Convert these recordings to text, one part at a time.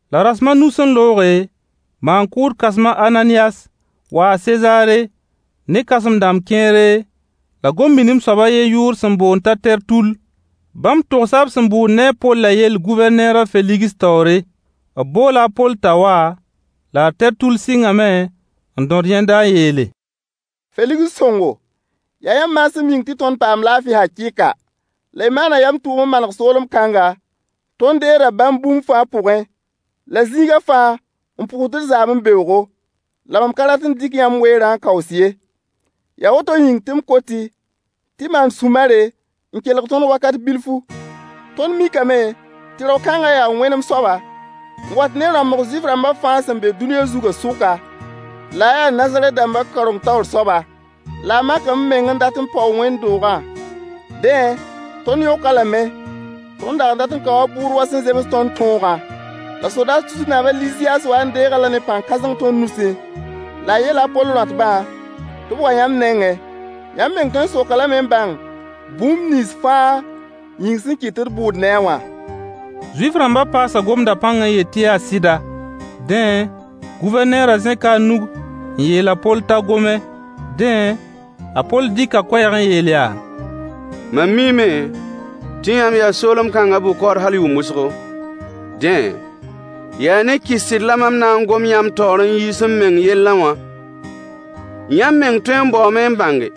La rasem a nu sẽn looge, maan-kʋʋd kãsem a Ananiyas waa Sezaare ne kãsem-dãmb kẽere la gom-minim soab a yen yʋʋr sẽn boond t'a Tertull. Bãmb togsa b sẽn bʋʋd ne a Pollã yell Gʋvɛrneer a Feligs taoore. B boola a Poll t'a wa, la a Tertull sɩngame n dõd yẽnda n yeele: Feligs sõngo, yaa yãmb maasem yĩng tɩ tõnd paamd laafɩ hakɩɩka, la y maana yam tʋʋm n maneg soolem kãngã, tõnd deegda bãmb bũmb fãa pʋgẽ, la zĩiga fãa n pʋʋsd d zaame beoogo. La mam ka rat n dɩk yãmb weerã n kaoos ye. Yaa woto yĩng tɩ m kot-y tɩ y maan sũ-mare n kelg tõnd wakat bilfu. Tõnd mikame tɩ rao-kãnga yaa wẽnem soaba n wat ne rãmbg Zuif-rãmba fãa sẽn be dũniyã zugã sʋka la a yaa Nazarɛt dãmba kaoreng taoor soaba. La a makame meng n dat n paoog wẽnd-doogã. Dẽ, tõnd yõk-a lame. [Tõnd dag n dat n kao a bʋʋd wa sẽn zems tõnd tõogã. La sodaas tusr naab a Liziyaas waa n deeg-a-la ne pãn-kãseng tõnd nusẽ. La a yeela a Poll rõatbã tɩ b wa yãmb nengẽ.] Yãmb meng tõe n sok-a lame n bãng bũmb nins fãa yĩng sẽn kɩt tɩ d bʋʋd ne-a wã. Zuif-rãmba paasa gomda pãng n yet tɩ yaa sɩda. Dẽ, Gʋvɛrneerã zẽka a nug n yeel a Poll t'a gome. Dẽ, a Poll dɩka koɛɛg n yeel yaa: Mam miime tɩ yãmb yaa soolem-kãngã bʋ-kaood hal yʋʋm wʋsgo. Dẽ, yaa ne kɩs-sɩd la mam na n gom yãmb taoor n yiis m meng yellẽ wã. Yãmb meng tõe n baoome n bãnge.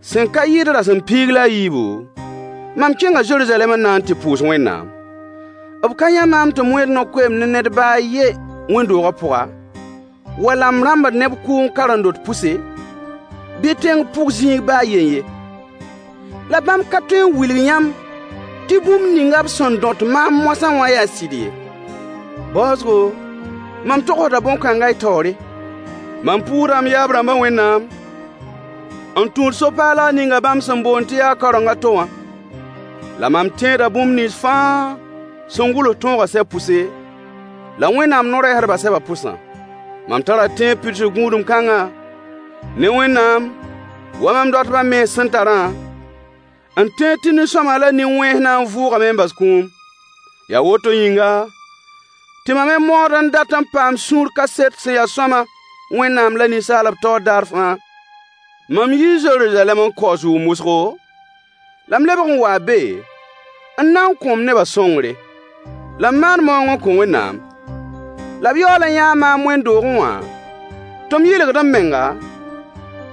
Sẽn ka yɩɩd rasem piig la a yiibu, mam kẽnga Zeruzalɛm n na n tɩ pʋʋs Wẽnnaam. B ka yã maam tɩ m wẽed no-koeemd ne ned ba a yen wẽnd-doogã pʋga, wala m rãmbd neb kʋʋng karen-dot pʋse, bɩ tẽng pʋg zĩig ba a yen ye. La bãmb ka tõe n wilg yãmb tɩ bũmb ninga b sẽn dõt maam moasã wã yaa sɩd ye. Baoosgo, mam togsda bõn-kãnga y taoore. Mam pʋʋsda m yaab-rãmbã Wẽnnaam n tũud so-paalg ninga bãmb sẽn boond tɩ yaa kaoreng a to wã. La mam tẽeda bũmb nins fãa sẽn gʋls tõogã sɛb pʋse, la Wẽnnaam no-rɛɛsdbã sɛbã pʋsã. Mam tara tẽeb pidsg gũudem kãnga, ne Wẽnnaam wa mam dõatbã mens sẽn tarã, n tẽed tɩ nin-sõama la nin-wẽns na n vʋʋgame n bas kũum. Yaa woto yĩnga, tɩ mam me maood n dat n paam sũur kaset sẽn ya sõama Wẽnnaam la ninsaalb taoore daar fãa. Mam yii Zeruzalɛm n kaoos yʋʋm wʋsgo, la m lebg n waa be n na n kõ m neba sõngre, la m maan maoong n kõ Wẽnnaam. La b yaool yãa maam wẽnd-doogẽ wã tɩ m yɩlgd m menga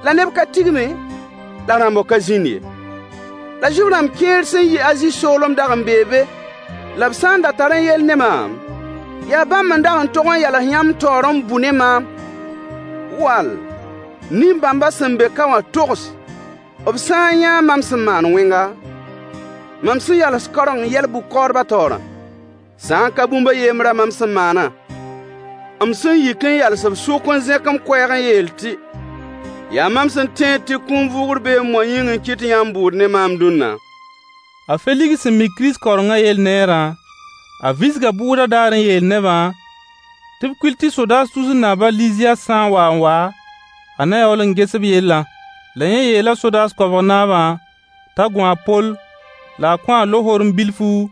la neb ka tigme, la rãmbg ka zĩnd ye. La Zuif-rãmb kẽer sẽn yi Azi soolem dag n bee be la b sã n da tarẽ yell ne maam yaa bãmb n dag tog n yals yãmb taoor n bʋ ne maam. Wall, nin-bãmba sẽn be ka wã togs b sã n yãa mam sẽn maan wẽnga, mam sẽn yals kaoreng yɛl-bʋ-kaoodbã taoorã. Sã n ka bũmb a yembrã mam sẽn maana, m sẽn yik n yals b sʋk n zẽk m koɛɛg n yeel tɩ: “Yaa mam sẽn tẽed tɩ kũum vʋʋgr beeme wã yĩng n kɩt tɩ yãmb bʋʋd ne maam dũnna.” A Feligs sẽn mi Kirist kaorengã yell neerã, a visga bʋʋdã daar n yeel nebã tɩ b kuil tɩ sodaas tusr naab a Liziyaas sã n wa n wa, a na yaool n ges b yellã. La yẽ yeela sodaas koabg naabã t'a gũ a Poll, la a kõ-a lohorem bilfu,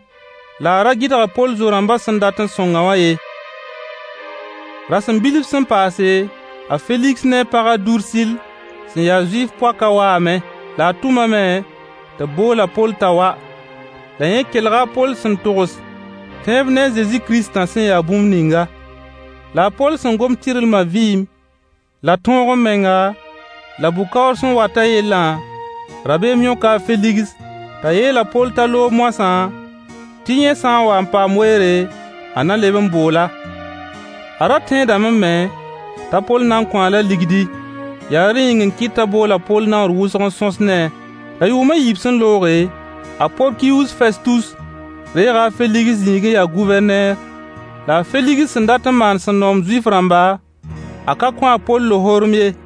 la a ra gɩdg a Poll zo-rãmbã sẽn dat n sõng-a wã ye. Rasem bilf sẽn paase, a Feligs ne a pag a Dursill sẽn ya Zuif poakã waame. La a tʋmame tɩ b bool a Poll t'a wa, la yẽ kelga a Poll sẽn togs tẽeb ne Kirist Zezi wã sẽn ya bũmb ninga. La a Poll sẽn gom tɩrlma vɩɩm la tõog-m-menga la bʋ-kaoor sẽn watã yellã, rabeem yõka a Feligs t'a yeel a Poll t'a loog moasã tɩ yẽ sã n wa paam weere a na leb n bool-a. A ra tẽedame me t'a Poll na n kõ-a-la ligdi, yaa rẽ yĩng n kɩt t'a bool a Poll naoor wʋsg n sõs ne-a. La yʋʋm a yiib sẽn looge, a Porkius Festus reega a Feligs zĩig n ya Gʋvɛrneer. La a Feligs sẽn dat n maan sẽn noom Zuif-rãmba, a ka kõ a Poll lohorem ye.